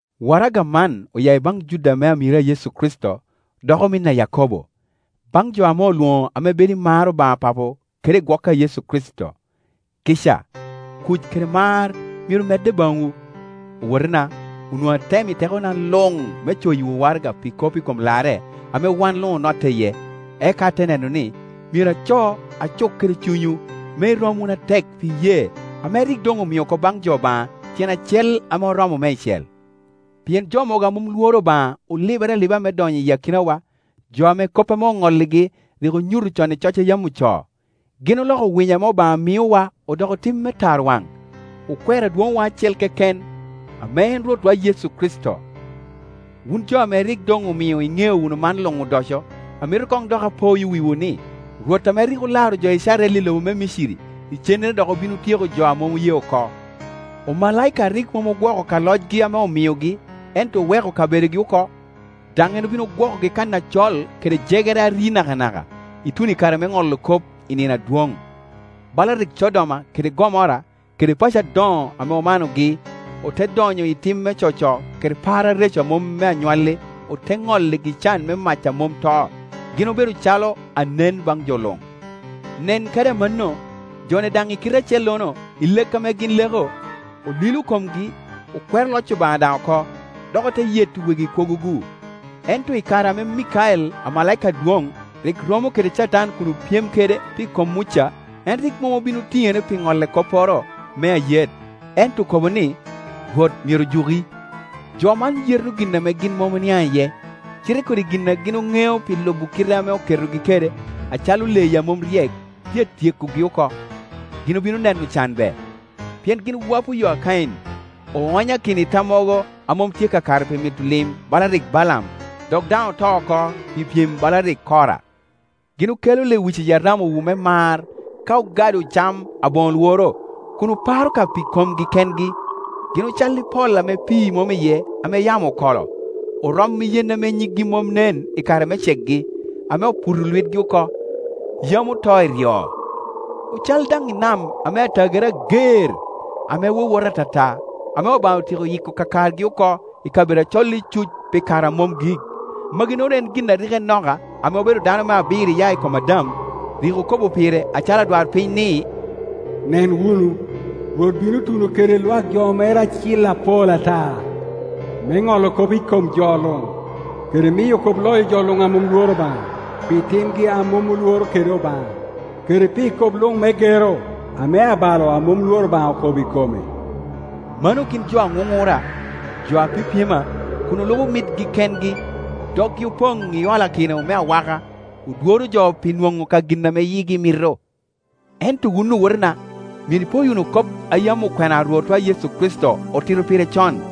Waraga man oya i baŋ Juda ame amiro a Yecu Kricito dok omin a Yakobo. Baŋ jo ame olwoŋo ame bedo i mar Obaŋa Papo kede i gwok a Yecu Kricito: Kica, kuc kede mar myero medde baŋwu. Owotena, onwoŋo atemo i tekona luŋ me coyiwu waraga pi kop i kom larre ame wan luŋ onotte iye, eka ate neno ni, myero aco acuk kede cunywu me irom wunu atek pi iyee ame rik doŋ omio oko baŋ jo Obaŋa tyen acel ame oromo meicel. Pien jo mogo a mom lworo Obaŋa olibere aliba me donyo i akinawa, jo ame kop ame oŋolligi rik onyuto con i coc a yam ocoo, Gin oloko winyo ame Obaŋa imiowa odoko tim me tarwaŋ, okwero Adwoŋwa acel keken ame en Rwotwa Yecu Kricito. Wun jo ame rik doŋ omio iŋeo wunu man luŋ odoco, amito koŋ dok apoyo wiwu ni, Rwot ame rik olaro jo Icrael i lobo me Miciri, icennere dok obin otyeko jo a mom oye oko. Omalaika a rik mom ogwoko ka locgi ame omiogi, ento oweko kabedogi oko, daŋ en obin ogwokogi kan acol kede jegere a ri nakanaka, ituno i kare me ŋolo kop i nino adwoŋ; bala rik Codoma kede Gomora kede paco adoŋo ame omanogi ote donyo i tim me coco kede par areco a mom me anywalli, ote ŋolligi can me mac a mom to, gin obedo calo anen baŋ jo luŋ. Nen kadi amanno, jo-ni daŋ i kite acellono, i lek ame gin leko, olilo komgi, okwero loc Obaŋa daŋ oko, dok ote yeto wegi kwogo-gu. Ento i kare ame Mikael, amalaika adwoŋ, rik romo kede Catan kun opyem kede pi kom Muca, en rik mom obin otiŋere pi ŋolle kopporo me ayet, ento okobo ni, “Rwot myero juki.” Jo man yeto gin ame gin mom oniaŋ iye, cite kodi gin a gin oŋeo pi lubo kite ame oketogi kede, acalo leyi a mom ryek, tye a tyekogi oko. Gin obino neno can be! Pien gin wopo yo a Kain, oonyakino i tammogo a mom tye kakare pi mito lim bala rik Balaam, dok dan oto oko pi pyem bala rik Kora. Gin okelo lewic iyi aramawu me mar ka ogado cam aboŋo lworo, kun oparo ka pi komgi kengi. Gin ocalli pol ame pii mom iye ame yamo okolo; orom i yen ame nyiggi mom nen i kare me cekgi, ame oputo lwitgi oko, yam oto iryo. Ocal dan i nam ame atagere ager, ame wowota ata ta, ame Obaŋa otyeko yiko kakargi oko i kabedo acol icuc pi kare a mom gik. Magi-nono en gin a rik Enoka, ame obedo dano me abiro iya i kom Adam, rik okobo pire acalo adwarpiny ni, “Nen wunu, Rwot bino tuno kede lwak jo mere acil apol ata, me ŋolo kop i kom jo luŋ, kede miyo kop loyo jo luŋ a mom lworo Obaŋa pi timgi a mom olworo kede Obaŋa, kede pi kop luŋ me gero ame abalo ame mom lworo Obaŋa okobo i kome.” Mano gin jo aŋuŋura, jo a pyepyema, kun olubo mitgi kengi, doggi opoŋ i olakino me awaka, odworo jo pi nwoŋo ka gin, ame yigi mito. Ento wun owotena, myero ipoyo wunu kop a yam okwena a Rwotwa Yecu Kricito otito pire con.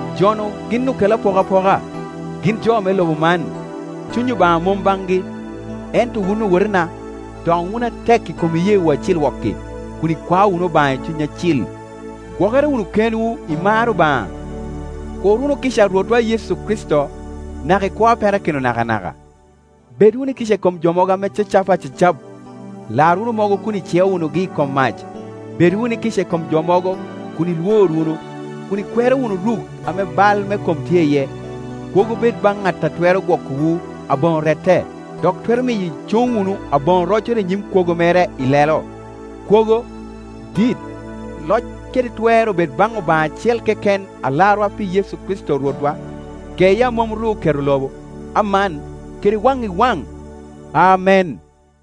Jo-nu gin okel apokapoka, gin jo me lobo man, Cuny Obaŋa mom baŋgi. Ento wun owotena, doŋ wunu atek i kom iyeewu acil wok-ki, kun ikwao wunu Obaŋa i Cuny Acil; gwokere wunu kenwu i mar Obaŋa, kur wunu kica a Rwotwa Yecu Kricito naka i kwo a perakino nakanaka. Bed wunu i kica i kom jo mogo ame cacapa acacap; lar wunu mogo kun iceo wunugi i kom mac; bed wunu i kica i kom jo mogo kun ilwor wunu, kun ikwero wunu ruk ame bal me kom tye iye. Kwogo bed baŋ ŋat a twero gwokowu aboŋo rette, dok twero miyo icuŋ wunu aboŋo roccoro i nyim kwogo mere ilelo. Kwogo, dit, loc kede twer obed baŋ Obaŋa acel keken Alarwa pi Yecu Kricito Rwotwa, geye a mom ru oketo lobo, aman, kede waŋ i wan. Amen.